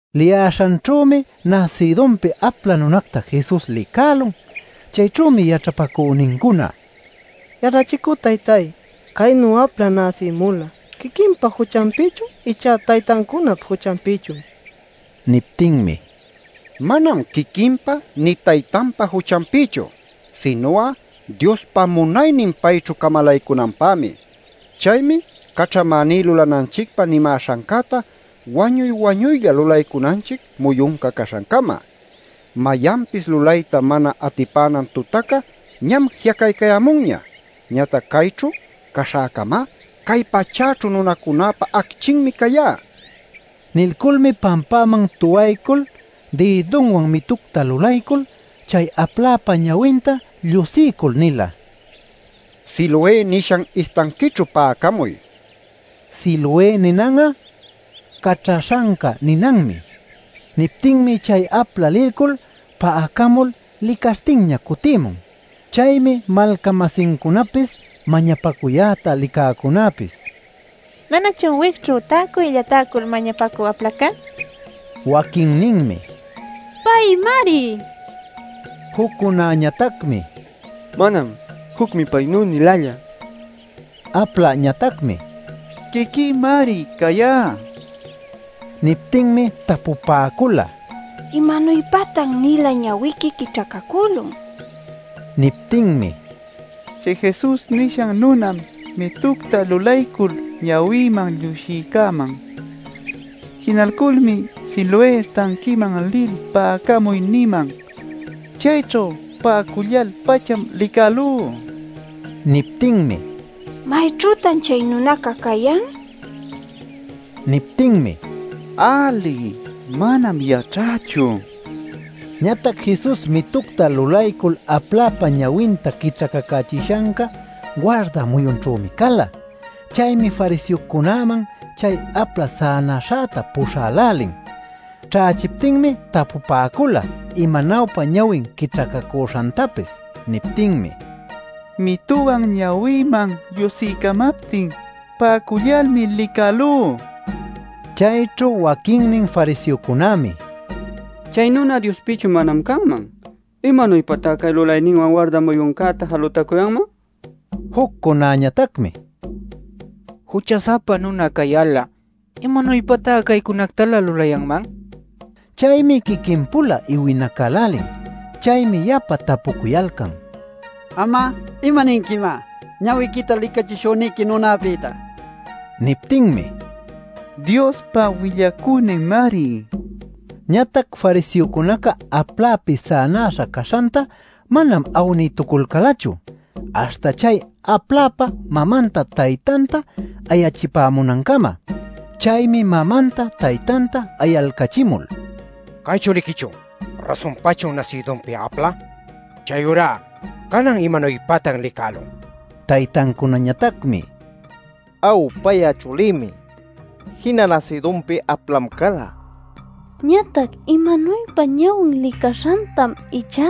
Liyäśhanćhümi nasïdunpi apla nunacta Jesus licälun. Chayćhümi yaćhapacünincuna: “Yaćhachicü taytay, caynu apla näsïmula ¿quiquinpa juchanpïchun icha taytancunap juchanpïchun?” nipäcula. Niptinmi: “Manam quiquinpa nï taytanpa juchanpïchu, sinu'a Diospa munaynin payćhu camalaycunanpämi. Chaymi caćhamäní lulananchicpä nimäśhancäta wañuy-wañuylla lulaycunanchic muyunca caśhancama. Mayanpis lulayta mana atipänan tutaca ñam ji'acaycayämunña. Ñatac cayćhu caśhäcamá, cay pachäćhu nunacunäpa acchinmi cayá” nin. Nilculmi pampäman tuwaycul dïdunwan mitucta lulaycul chay apläpa ñawinta llusiycul nila: “Siloé nishan istanquićhu pa'acamuy” nil. (Siloé ninan'a “Caćhaśhanca” ninanmi.) Niptinmi chay apla lilcul pa'acamul licaśhtinña cutïmun. Chaymi malca-masincunapis, mañapacuyäta licäcunäpis: “¿Manachun wicćhu täcuylla täcul mañapacü aplaca?” nipäcula. Waquinninmi “Paymari” nipäcula. Juccunañatacmi “Manam. Jucmi paynü-nilälla” nipäcula. Apläñatacmi: “Quiquïmari cayá” nila. Niptinmi tapupäcula: “¿Imanuypatan-nila ñawiqui quićhacacülun?” nil. Niptinmi: “Chay Jesus nishan nunam mitucta lulaycul ñawïman llusiycäman. Jinalculmi ‘Siloé istanquiman lil pa'acamuy’ niman. Chayćhu pa'acullal-pacham licälú” nin. Niptinmi: “¿Mayćhütan chay nunaca cayan?” nipäcula. Niptinmi: “Äli, manam yaćhächu” nin. Ñatac Jesus mitucta lulaycul apläpa ñawinta quićhacachishanca warda muyunćhümi cala. Chaymi fariseocunäman chay apla sänäśhäta puśhälälin. Ćhächiptinmi tapupäcula imanuypa ñawin quićhacacüśhantapis. Niptinmi: “Mituwan ñawïman llusiycamaptin pa'acullalmi licälú” nin. Chayćhu waquinnin fariseocunämi: “Chay nuna Diospïchu manam canman. ¿Imanuypatá cay lulayninwan warda muyuncäta jalutacuyanman?” nipäcula. Juccunañatacmi: “Jucha-sapa nuna cayal'a, ¿imanuypatá caynücunactalä lulayanman?” nipäcun. Chaymi quiquin-pula iwinacälälin. Chaymi yapa tapucuyalcan: “Am'a ¿imaninquimá, ñawiquita licachishüniqui nunapïta?” nil. Niptinmi: “Diospa willacüninmari” nin. Ñatac fariseocunaca aplapi sänaśha caśhanta manam awnïtuculcälachu, aśhta chay apläpa mamanta taytanta ayachipämunancama. Chaymi mamanta taytanta ayalcachimul: “¿Cay chuliquichun? ¿Rasunpachun nasïdunpi apla? Chayurá ¿canan imanuypatan licälun?” nin. Taytancunañatacmi: “Aw, pay'a chulïmi; jina nasïdunpi aplam cala. Ñatac imanuypa ñawin licaśhantam ichá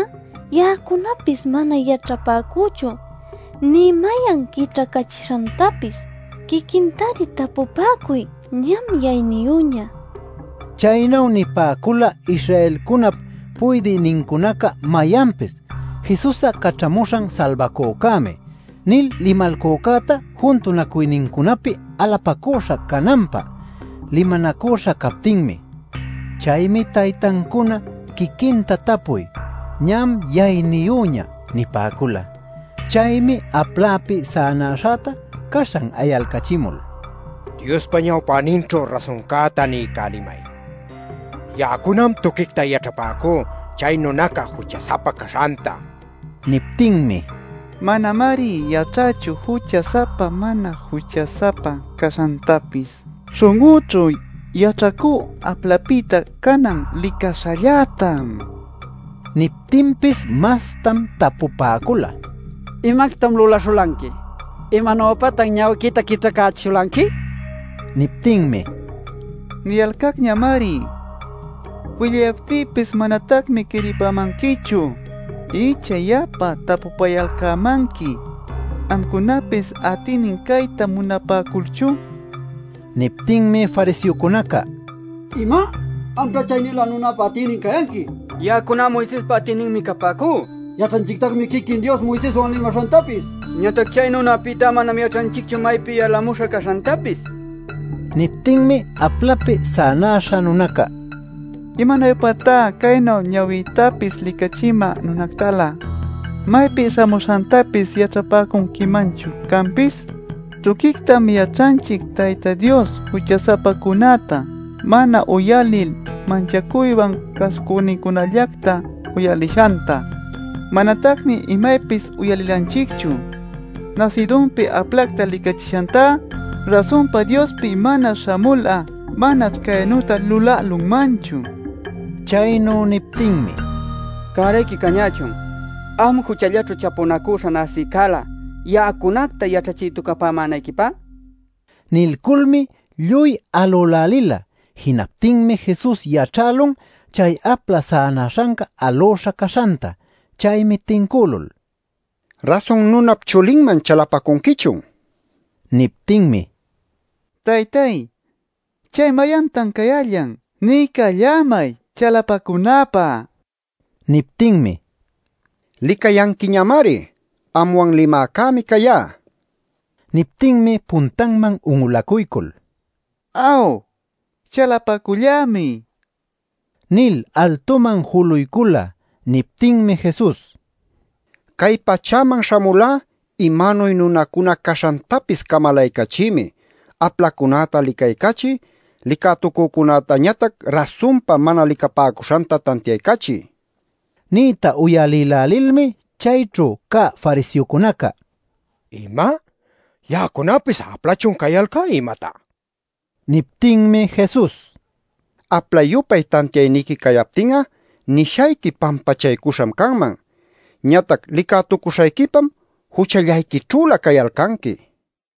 ya'acunapis mana yaćhapäcüchu nï mayan quićhacachishantapis. Quiquintari tapupäcuy; ñam yayniyüña” nipäcun. Chaynu nipäcula Israelcunap puydïnincunaca mayanpis “Jesus'a Caćhamuśhan Salbacücämi” nil limalcücäta juntunacuynincunapi alapacüśha cananpä limanacüśha captinmi. Chaymi taytancuna “Quiquinta tapuy; ñam yayniyüña” nipäcula. Chaymi aplapi sänäśhäta caśhan ayalcachimul: “Diospa ñawpäninćhu rasuncäta niycälimay. Ya'acunam tuquicta yaćhapäcú chay nunaca jucha-sapa caśhanta” nin. Niptinmi: “Manamari yaćhächu jucha-sapa mana jucha-sapa caśhantapis. Śhun'ućhu yaćhacú aplapïta canan licaśhallätam” nila. Niptinpis mastam tapupäcula: “¿Imactam luläśhulanqui? ¿Imanuypatan ñawiquita quićhacächishulanqui?” nil. Niptinmi: “Niyalcacñamari; willayaptïpis manatacmi quiripämanquichu. ¿Icha yapa tapupayalcämanqui amcunapis atïnin cayta munapäculchun?” nin. Niptinmi fariseocunaca: “¡Ima! ¡Amćhá chay-nilä nunäpa atïnin cayanqui; ya'acuná Moisespa atïninmi capäcú! Yaćhanchictacmi quiquin Dios Moiseswan limaśhantapis. Ñatac chay nunäpïtá manam yaćhanchicchu maypi yalämuśha caśhantapis” nipäcula. Niptinmi aplapi sänäśha nunaca: “¡¿Imanuypatá caynu ñawïtapis licachimä nunactalä maypi śhamuśhantapis yaćhapäcunquimanchu canpis?! Tuquictam yaćhanchic Tayta Dios jucha-sapacunäta mana uyalil manchacuywan cäsucünincunallacta uyalishanta. Manatacmi imaypis uyalilanchicchu nasïdunpi aplacta licächishantá. Rasunpa Diospi mana śhamul'a manaćh caynüta lulälunmanchu” nin. Chaynu niptinmi: “¡Cärayqui cañächun am juchallaćhu chapunacüśha näsïcälä ya'acunacta yaćhachïtucupämänayquipä!” nicuyalcan. Nilculmi lluy alülälila. Jinaptinmi Jesus yaćhälun chay apla sänäśhanca alüśha caśhanta. Chaymi tincülul: “¿Rasun Nunap Chulinman chalapacunquichun?” nin. Niptinmi: “Taytay ¿chay mayantan cayällan? Niycallämay chalapacunäpä” nin. Niptinmi: “Licayanquiñamari; anwan limäcämi cayá” nin. Niptinmi puntanman un'ulacuycul: “Aw, chalapacullämi” nil altuman juluycula. Niptinmi Jesus: “Cay pachäman śhamulá imanuy nunacuna caśhantapis camalaycachïmi, aplacunäta licaycachï, licätucücunätañatac rasunpa mana licapäcuśhanta tantiaycachï” nin. Niyta uyalïlälilmi chayćhu cä fariseocunaca: “¿Ima, ya'acunapis aplachun cayalcá imatá?” nicuyalcan. Niptinmi Jesus: “Aplapa-yupay tantiayniqui cayaptin'a nishayqui pampachaycuśham canman. Ñatac licätucuśhayquipam juchallayquićhülä cayalcanqui” nila.